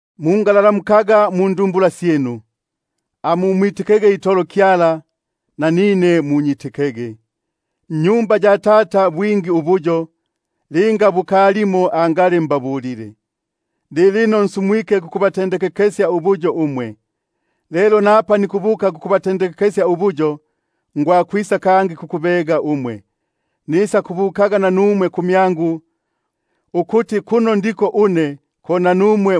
Mungalalamukaga indumbula syinu; amumwitikege itolo Kyala, nanine munyitikege. Nnyumba ya Tata bwingi ubuyo; linga bukalimo angali mbabulile, buno nsumwike kukubatendekekesya ubuyo umwe. Lelo napa nikubuka kukubatendekekesya ubuyo, ngwisa kangi, nisakubambililaga kumyangu, ukuti kuno ndiko une ko nanumwe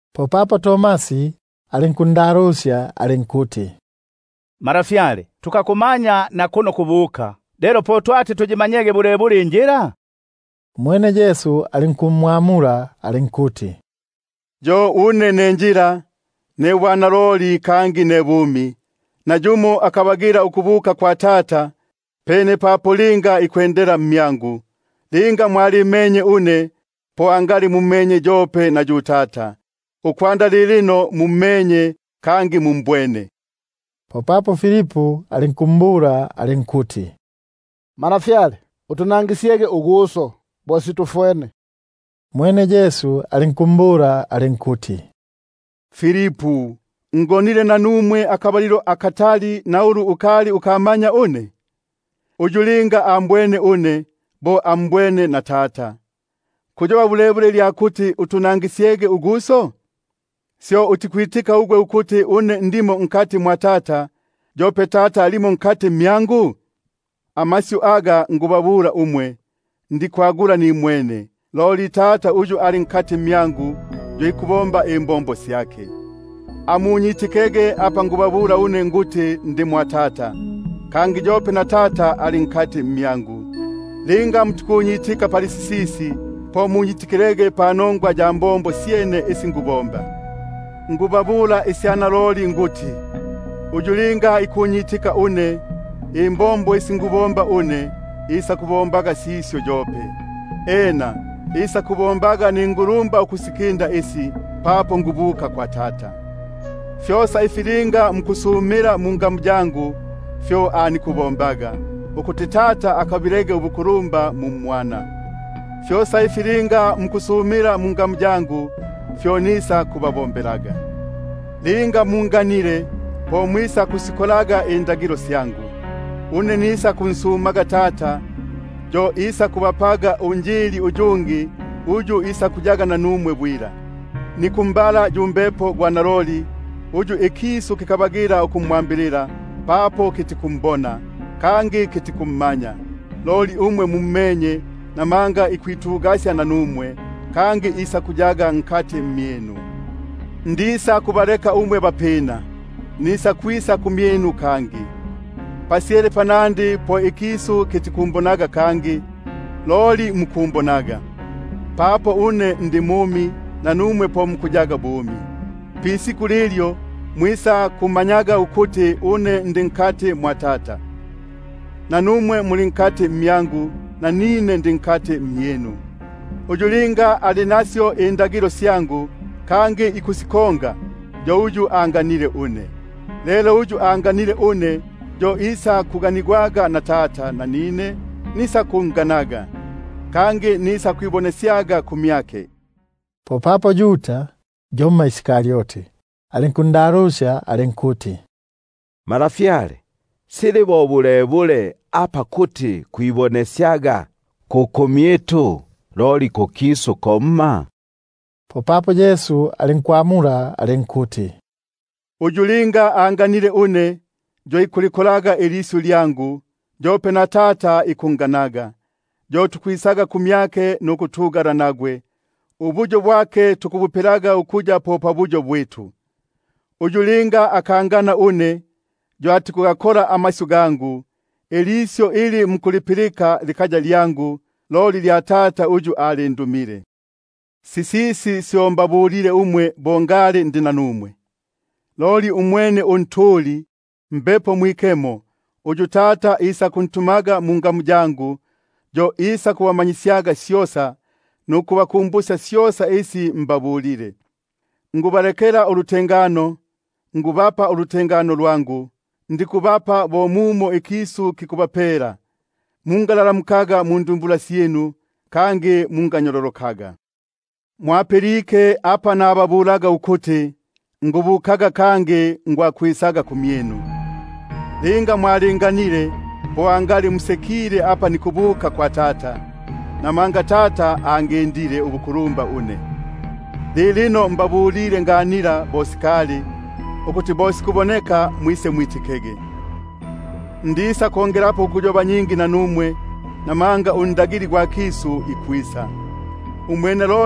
Popapo Tomasi alinkumbula alinkuti: Malafyale, tukakumanya nakuno kubuka, lelo po tukuyimanyaga bulebule injila? Umwene Yesu alinkumbula alinkuti: Yo une ne njila, ne bwanaloli kangi ne bumi; nayumo atikwisako kwa Tata, pene papo linga ikwendela mmyangu. Linga mwalimenye une, po angali mummenye yope na yu Tata; ukwanda lilino mummenye kangi mumbwene. Popapo Filipu alinkumbula alinkuti: Utunangisyege uGuso, bo situfwene. Umwene Yesu alinkumbula alinkuti: Ngonile nanumwe akabalilo akatali, na ulu ukali ukamanya une gwe Filipu? Uyu linga ambwene une, bo ambwene na Tata; po fiki apa kuti utunangisyege uGuso? Syo utikwitika ugwe ukuti une ndi mwa Tata, yope Tata ali mmyangu? Amasyu aga nikubabula, ndikwagula nimwene; loli Tata uyu ali mmyangu, yo ikubomba imbombo syake. Amunyitikege ukuti une ndi mwa Tata, yope na Tata ali mmyangu; linga mutikunyitika panongwa iyi, po munyiti- kilege panongwa ya mbombo syene. Naloliloli nikubabula une nikuti, uyu linga ikunyitika une, imbombo isi nikusibomba une yope isakusibombaga; kangi isakubombaga ningulumba ukusikinda isi, papo nikubuka kwa Tata. Fyosa ifi linga mukusumila mungamu yangu, fyo nikubombaga, ukuti Tata akabilege ubukulumba mu mMwana. Fyosa ifi linga mukusumila mungamu yangu, fyo nisakubabombelaga. Linga munganile, po mwisakusikongaga indagilo syangu. Une nisakunsumaga Tata, yo isakubapaga Un jili uyungi, ukuti ayege nanumwe bwila; yu Mbepo gwa naloli, uyu ikisu kikamanya ukumwambilila, namanga kitikumbona, kangi kitikummanya; loli umwe mummenye, buno ikwitugasya nanumwe, kangi isakuyaga mmyinu. Ndisakubaleka bapina umwe, nikwisa kumyinu. Pasyele panandi po ikisu kitikumbonaga kangi, loli umwe mwe mukumbonaga, papo une ndi mumi, nanumwe po mukuyaga bumi. Pisiku lilyo, mwisakumanyaga ukuti une ndi mwa Tata, kangi umwe muli mmyangu, nanine ndi mmyinu. Uyu linga ali nasyo indagilo syangu, kangi ikusikonga, yo uyu anganile une; lelo uyu anganile une, yo isakuganigwaga na Tata, nanine nisakunganaga, kangi nisakwibonesyaga kumyake. Popapo Yuda (yomma ugwa mu-Karioti) alinkundalusya alinkuti: Malafyale, sili bo bulebule apa kuti kwibonesyaga ku kumyitu, loli kukisu komma? Popapo Yesu alinkumwamula alinkuti: Linga yumo anganile une, yo ikulikongaga ilisyu lyangu, yope na Tata ikunganaga, yo tukwisaga kumyake, kangi tukupapelaga ukuya po pabuyo bwitu pamyake. Uyu linga akangana une, yo atikugakonga amasyu gangu; ilisyu ili mukulipilika likaya lyangu, loli lya Tata uyu alindumile. Sisisi syo mbabulile umwe bo ngali ndi nanumwe. Loli umwene Un jili, Mbepo Mwikemo, uyu Tata isakuntumaga mungamu yangu, yo isakubamanyisyaga syosa, nukubaku- mbusya syosa isi mbabulile. Nikubalekela ulutengano, nikubapa ulutengano lwangu; ndikubapa bo mumo ikisu kikubapela. Mungalalamukaga indumbula syinu, kangi mu- nganyololokaga. Mupilike apa nababulaga ukuti, nikubukaga, kangi nikwisaga kumyinu. Linga mwalinganile, po angali musekile apa nikubuka kwa Tata, namanga Tata angindile ubukulumba une. Lilino mbabulile nganila bo sikali, ukuti bo sikuboneka mwisemwitikege. Ndisakongelapo ukuyoba nyingi nanumwe, buno ikwisa unkulumba gwa kisu. Umwene